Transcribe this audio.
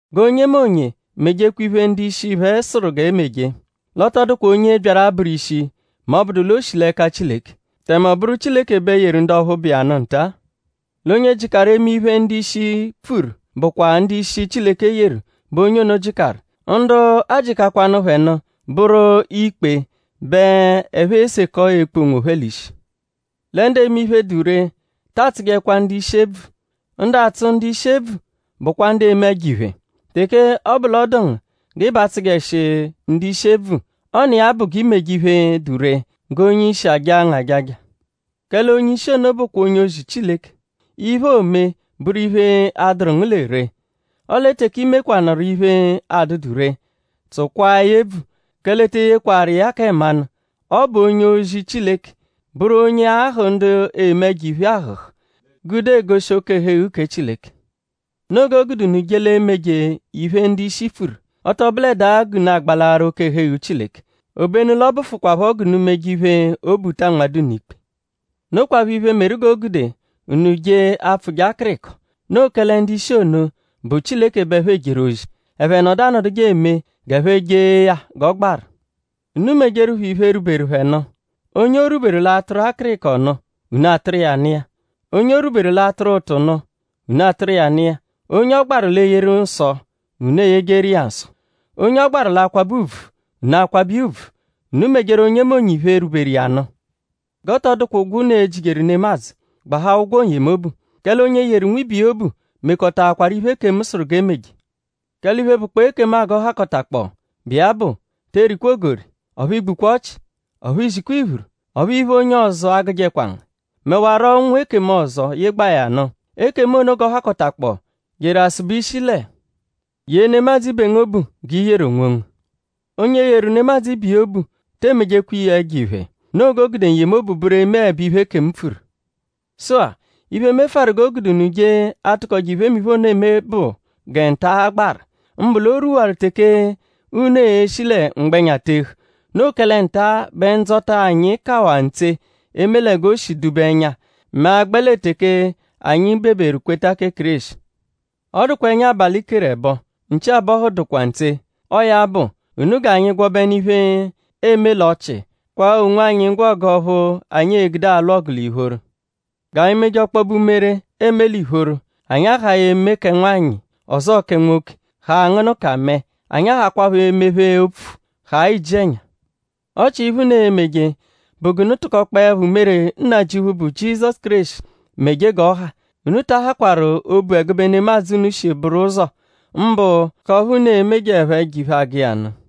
G'onyemonye mejekwa iphe, ndu-ishi phẹ sụru g'e meje. L'ọ tọ dụkwa onye byaru abụru ishi mẹ ọ -bụdu l'o shi l'ẹka Chileke; tẹme ọ bụru Chileke bẹ yeru ndu ọphu bụ iya nụ nta-a. L'onye jịkaru eme iphe, ndu-ishi pfuru bụkwa ndu-ishi, Chileke yeru bẹ onye ono jịkaru. Ndu ajịkakwanu phẹ nụ bụru ikpe bẹ ẹphe esekọ ekpu onwophẹ l'ishi. Lẹ ndu eme iphe, dụ ree ta atsụjekwa ndu-ishi ebvu. Ndu atsụ ndu-ishi ebvu bụkwa ndu eme ẹjo-iphe. Teke ọ bụ l'ọ dụ ngu g'ị b'atsụjeshi ndu-ishi ebvu; ọ n'iya bụ g'i meje iphe, dụ ree g'onye-ishi ajaa ngu ajaja. Kẹle onye-ishi ono bụkwa onye-ozi Chileke; iphe, oome bụru iphe, a-dụru ngu lẹ ree. Ọle teke i mekwanụru iphe, adụdu ree; tsụkwaa ya ebvu; kẹle e te eyekwaru iya kẹ mmanụ. Ọ bụ onye-ozi Chileke; bụru onye ahụ̀ ndu eme ẹjo-iphe ahụ̀hù gude egoshi oke-ẹhu-eghu kẹ Chileke. Noo g'o gude unu je l'emeje iphe, ndu-ishi pfuru; ọ tọ bụledaa g'unu agbalaaru oke-ẹhu-eghu Chileke; obenu l'ọ bụfukwaapho g'unu meje iphe, obu ta anmadụ unu ikpe. Nokwaphọ iphe, meru g'o gude unu je apfụje akịriko. Noo kẹle ndu-ishi ono bụ Chileke bẹ ẹphe ejeru ozi; ẹphe nọdu anọduje eme g'ẹphe jee ya g'ọ gbaru. Unu mejeru phẹ iphe, rwuberu phẹ nụ. Onye o rwuberu l'atụru akịriko nụ; unu atụru iya nụ iya; onye o rwuberu l'atụru ụtu nụ; unu atụru ụtu nụ iya; onye ọ gbaru l'eyeru nsọ; unu eyejeru iya nsọ; onye ọ gbaru l'akwabẹ ùbvù; unu akwabẹ iya ùbvù. Unu mejeru onyemonye iphe, rwuberu iya nụ. G'ọ tọ dụkwa ụgwo, unu e-jijeru nemadzụ; gbahaa ụgwo n-yemobu. Kẹle onye yeru nwibe iya obu mekọtaakwaru iphe, ekemu sụru g'e meje. Kẹle iphe, bụkpoo ekemu-a g'ọ hakọtakpoo, bụ iya bụ; te erikwa ogori; ọphu i gbukwa ọchi; ọphu i zikwa iphuru; ọphu iphe, onye ọzo agụjekwa ngu; mẹwaro ụnwu ekemu ọzo, yịgbaa ya nụ. Ekemu ono g'ọ hakọtakpoo jeru asụbe ishi lẹ: “Yee nemadzụ ibe ngu obu g'i yeru onwongu.” Onye yeru nemadzụ ibiya obu te emejekwa iya ẹjo-iphe. Noo g'o gude n-yemobu bụru emeẹbe iphe, ekemu pfuru. Sụ-a; iphe mefụaru g'o gude unu je atụkoje iphemiphe ono eme bụ gẹ nta-a gbaru; mbụ l'o rwuwaru teke unu e-shi lẹ mgbẹnya tehu. Noo kẹle nta bẹ ndzọta anyi kawaa ntse eme lẹ g'o shi dụ-be ẹnya mẹ a -gbẹ lẹ teke anyi beberu kweta kẹ Kéreshi. Ọ dụkwaa ẹnya abalị keru ẹbo; nchi abọhu dụkwaa ntse. Ọo ya bụ; unu g'anyi gwọbenu iphe, eeme l'ọchii; kwaa onwanyi ngwọgu ọphu anyi e-gude alwụ ọgu l'ìphóró. G'anyi meje ọkpobe umere, eme l'ìphóró; anyi ahaa eme kẹ nwanyị ọzoo kẹ nwoke; haa angụnuka mẹe. Anyi ahakwaaphọ emephe opfu; haa iji-ẹnya. Ọ chia iphe, unu e-meje bụ g'unu tụkokpoepho umere Nnajịuphu, bụ Jizọsu Kéreshi meje g'ọha. Unu ta ahàkwaru obu ẹgube nemadzụ, unu shi bụru ụzo; mbụ k'ọphu unu e-mejeẹpho ẹjo-iphe agụ iya nụ.